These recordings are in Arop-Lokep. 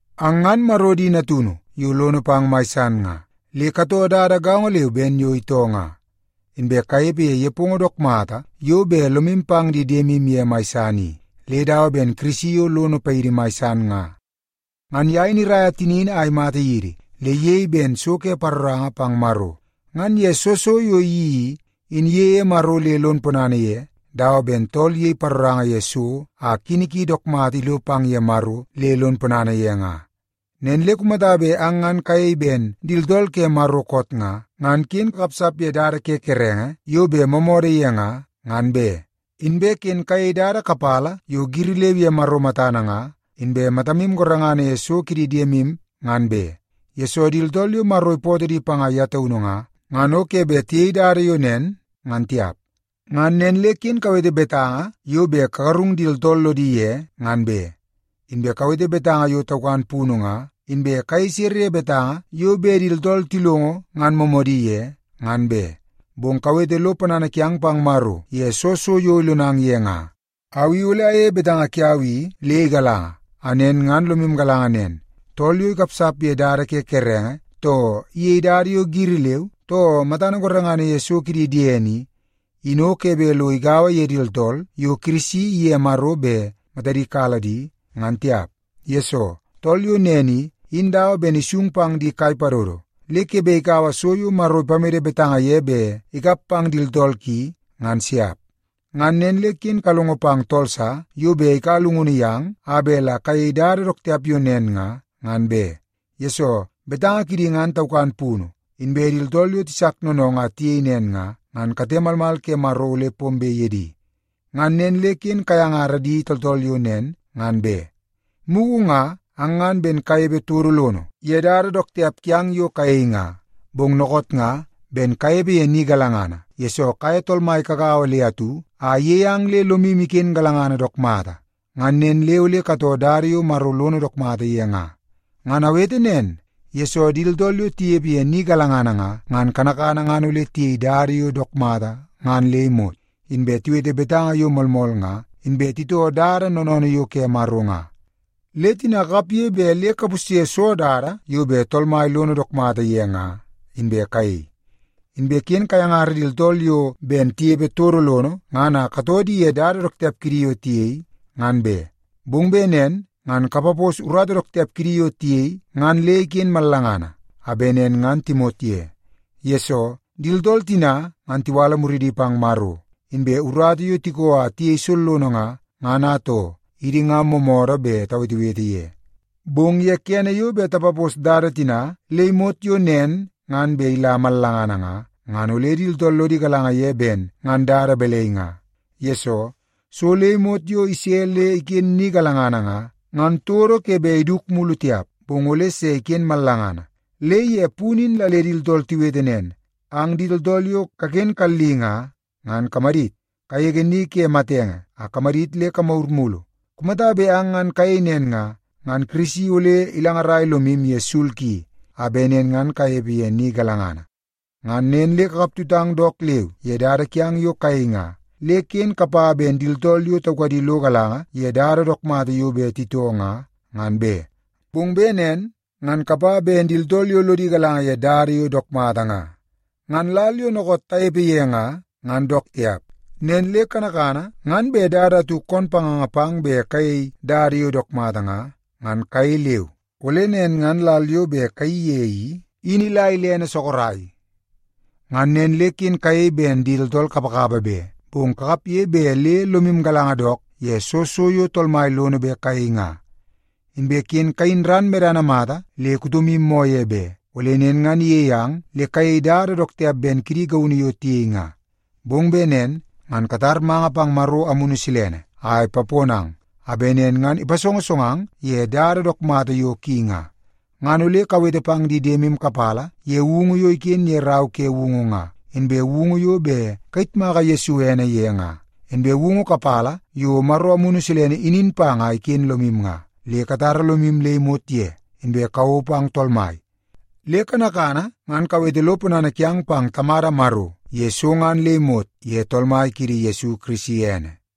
Ang ngan Maro di natunu yo lono pang mai san nga, le katoo dada gaongo leu ben yo itoo nga. Inbe kanepe ye nepongo dook mata yo bet lomu pang di diemu ye mai san i, le dawa ben Kirisi yo lono paidi mai san nga. Ngan ye in iraia tinini a imata yidi, le iyei ben so ke paroranga pang Maro. Ngan ye soo so yo iyeii i, in iyeie Maro le lon ponana ye, dawa ben tool iyei paroranga ye so a kini ki dook mata ilo pang ye Maro le lon ponana ye nga. Nen le kumata bet ang ngan kayei ben di tooltool ke Maro koot nga, ngan ken kakapsap ye dada ke kerenge yo bet moomoodoo ye nga, ngan be. Inbe ken kayei dada kapala yo giri leu ye Maro matana nga, inbe matamu gorengana ye so ke di diemu ngan be, yesoo di tooltool yo Maro ipootoo di panga ye taunu nga, ngan o ke bet tiyei dada yo nen, ngan tiap. Ngan nen le ken kawete betanga yo bet kagarung di tooltool lodi ye nga, ngan be. Inbe kawete betanga yo taukan punu nga, inbe kayei sere ye betanga yo bet di tooltool tilongo ngan moomoodi ye, ngan be. Bong kawete lo ponana kiang pang Maro ye soo so yo ilonang ye nga. Au i ole ayeie betanga kiau i le igalanga, a nen ngan lomu galanga nen: Tool yo ikapsap ye dada ke di kerenge, too iyei dada yo giri leu, too matana gorengana ye so kidi diene i, in o ke bet lo igaua ye di tooltool yo Kirisi iye Maro bet matadi kala di, ngan tiap. Yesoo, tool yo nen i, in dawa ben isung pang di kai padodo, le ke bet ikaua so yo Maro ipamede betanga ye bet ikap pang di tooltool ki, ngan siap. Ngan nen le ken kalongo pang tool sa yo bet ikaua llungunu yang a bet la kayei dada dook tiap yo nen nga, ngan be. Yesoo, betanga kidi ngan taukan punu, inbe di tooltool yo tisak noonoongoo a tiyei nen nga, ngan kate malmal ke Maro ole pombe ye di. Ngan nen le ken kayangara di tooltool yo nen, ngan be. Mugu nga ang ngan ben kanepe todo lono ye dada dook tiap kiang yo kayei nga, bong dookoot nga ben kanepe ye ni galangana, yesoo kaye Tool Mai kagaua le atu a iyei ang le lomu iken galangana dook mata. Ngan nen le ole katoo dada yo Maro lono dook mata ye nga. Ngan awete nen, yesoo di tooltool yo tinepe ye ni galangana nga, ngan kanakana ngan ole tiyei dada yo dook mata ngan le imot, inbe tiwete betanga yo moolmool nga, inbe titoo dada noonoonoo yo ke Maro nga. Le tina kakapge bet le kapusye soo dada yo bet Tool Mai lono dook mata ye nga, inbe kayei. Inbe ken kayangara di tooltool yo ben tinepe todo lono ngan a katoo di ye dada dook tiap kidi yo tiyei, ngan be. Bong bet nen ngan kapapos urata dook tiap kidi yo tiyei ngan le iken mallangana, a bet nen ngan timot ye. Yesoo, di tooltool tina ngan tiwala muridi pang Maro, inbe urata yo tiko a tiyei sollono nga, ngan atoo, idi nga moomoodoo bet tawetewete ye. Bong ye kene yo bet tapapos dada tina le imot yo nen ngan bet ila mallangana nga, ngan ole di tooltool lodi galanga ye ben ngan dada balai nga. Yesoo, so le imot yo ise le iken ni galangana nga, ngan todo ke bet iduku mulu tiap, bong ole se iken mallangana. Le ye punu in la le di tooltool tiwete nen: “Ang di tooltool yo kaken kalli nga, ngan kamadit! Kagege ni ke matenge a kamadit le kamagur mulu. Kumata bet ang ngan kayei nen nga, ngan Kirisi ole ilangarai lomu ye sul ki, a bet nen ngan kanepe ye ni galangana.” Ngan nen le kakap tutang dook leu ye dada kiang yo kayei nga, le ken kapa ben di tooltool yo taukadi lo galanga ye dada dook mata yo bet titoo nga, ngan be. Bong bet nen ngan kapa ben di tooltool yo lodi galanga ye dada yo dook mata nga. Ngan lal yo dookoot tanepe ye nga, ngan dook tiap. Nen le kanakana ngan bet dada atu koon panganga pang bet kayei dada yo dook mata nga, ngan kayei leu, ole nen ngan lal yo bet kayeii ye i, in ila ilene sorok. Ngan nen le ken kayei ben di tooltool kapakapa be, bong kakapge bet le lomu galanga dook ye soo so yo Tool Mai lono bet kayei nga. Inbe ken kayin ran medana mata le kutomu moo ye be, ole nen ngan iyei ang le kayei dada dook tiap ben kidi gaunu yo tiyei nga. Bong bet nen ngan katar manga pang Maro Amunu Silene a ipaponang, a bet nen ngan ipasongosongang ye dada dook mata yo ki nga. Ngan ole kawete pang di diemu kapala ye woungu yo iken ye Rau ke Woungu nga, inbe woungu yo bet kayitmaka Yesu ene ye nga, inbe woungu kapala yo Maro Amunu Silene inin pang a iken lomu nga. Le katara lomu le imot ye, inbe kawou pang Tool Mai. Le kanakana ngan kawete lo ponana kiang pang Tamada Maro ye so ngan le imot ye Tool Mai kiidi Yesu Kirisi ene.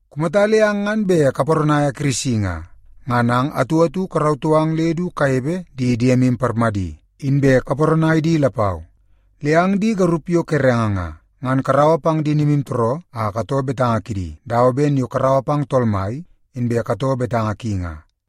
Kumata le ang ngan bet kaparanaia Kirisi nga, ngan ang atu atu karautoo ang le du kanepe di diemu parmadi, inbe kaparanai di lapau. Le ang di garup yo kerenge nga, ngan karaua pang di nimutooroo a katoo betanga kidi dawa ben yo karaua pang Tool Mai, inbe katoo betanga ki nga.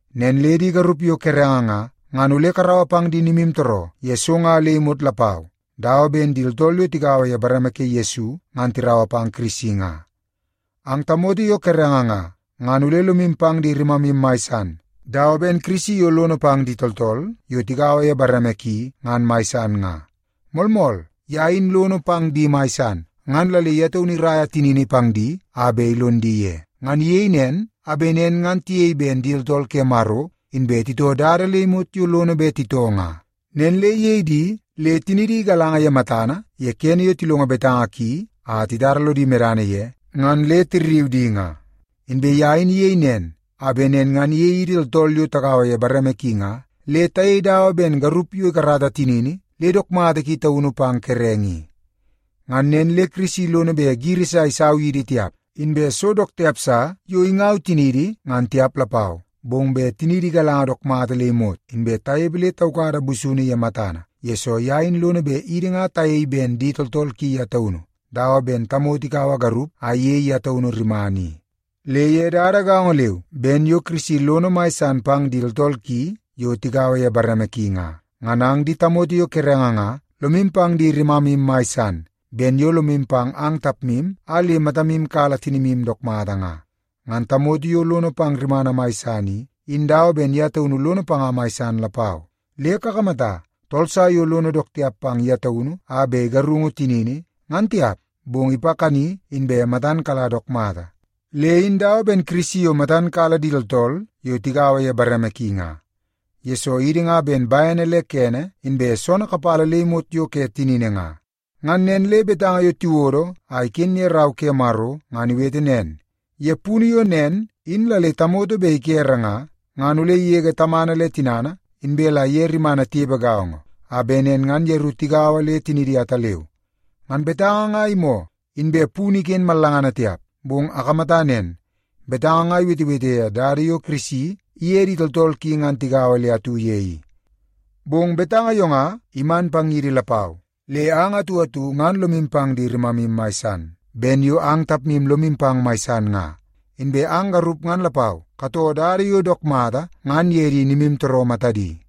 Nen le di garup yo kerenge nga, ngan ole karaua pang di nimutooroo ye so nga le imot lapau, dawa ben di tooltool yo tigaua ye bareme ke Yesu ngan tiraua pang Kirisi nga. Ang tamoto yo kerenge nga, ngan ole lomu pang di rimamu mai san, dawa ben Kirisi yo lono pang di tooltool yo tigaua ye bareme ki ngan mai san nga. Moolmool, ye in lono pang di mai san, ngan la le ye taunu iraia tinini pang di a bet ilon di ye. Ngan iyei nen, a bet nen ngan tiyei ben di tooltool ke Maro, inbe titoo dada le imot yo lono bet titoo nga. Nen le iyei di le tinidi igalanga ye matana ye kene yo tilongo betanga ki a titara lodi medana ye ngan le tirriu di nga. Inbe ye in iyei nen, a bet nen ngan iyei idi tooltool yo tagaua ye bareme ki nga, le tayei dawa ben garup yo ikarata tinini le dook mata ki taunu pang kerenge i. Ngan nen le Kirisi lono bet giri sa isau yidi tiap, inbe so dook tiap sa yo ingaua tiniidi ngan tiap lapau, bong bet tiniidi igalanga dook mata le imot, inbe tanepe le taukada busunu ye matana, yesoo ye in lono bet idi nga tayei ben di tooltool ki ye taunu, dawa ben tamoto ikaua garup a iyei ye taunu rimana i. Le ye dada gaongo leu ben yo Kirisi lono mai san pang di tooltool ki yo tigaua ye bareme ki nga, ngan ang di tamoto yo kerenge nga, lomu pang di rimamu mai san, ben yo lomu pang ang tapmu a le matamu kala tinimu dook mata nga. Ngan tamoto yo lono pang rimana mai san i, in dawa ben ye taunu lono panga mai san lapau. Le kakamata, tool sa yo lono dook tiap pang ye taunu a bet igarungu tinini, ngan tiap, bong ipakani inbe matan kala dook mata. Le in dawa ben Kirisi yo matan kala di tooltool yo tigaua ye bareme ki nga, yesoo idi nga ben bene le kene inbe soonoo kapala le imot yo ke tinini nga. Ngan nen le betanga yo tiwodo a iken ye Rau ke Maro ngan iwete nen, “Ye punu yo nen in la le tamoto bet ikere nga, ngan ole igege tamana le tinana, inbe la iye rimana tinepe gaongo, a bet nen ngan yeru tigaua le tinidi ataleu.” Ngan betanga nga imoo, inbe punu iken mallangana tiap, bong akamata nen; betanga nga iwetewete ye dada yo Kirisi iye di tooltool ki ngan tigaua le atu ye i. Bong betanga yo nga iman pang yidi lapau. Le ang atu atu ngan lomu pang di rimamu mai san, ben yo ang tapmu lomu pang mai san nga. Inbe ang garup ngan lapau, katoo dada yo dook mata ngan ye di nimutooroo matadi.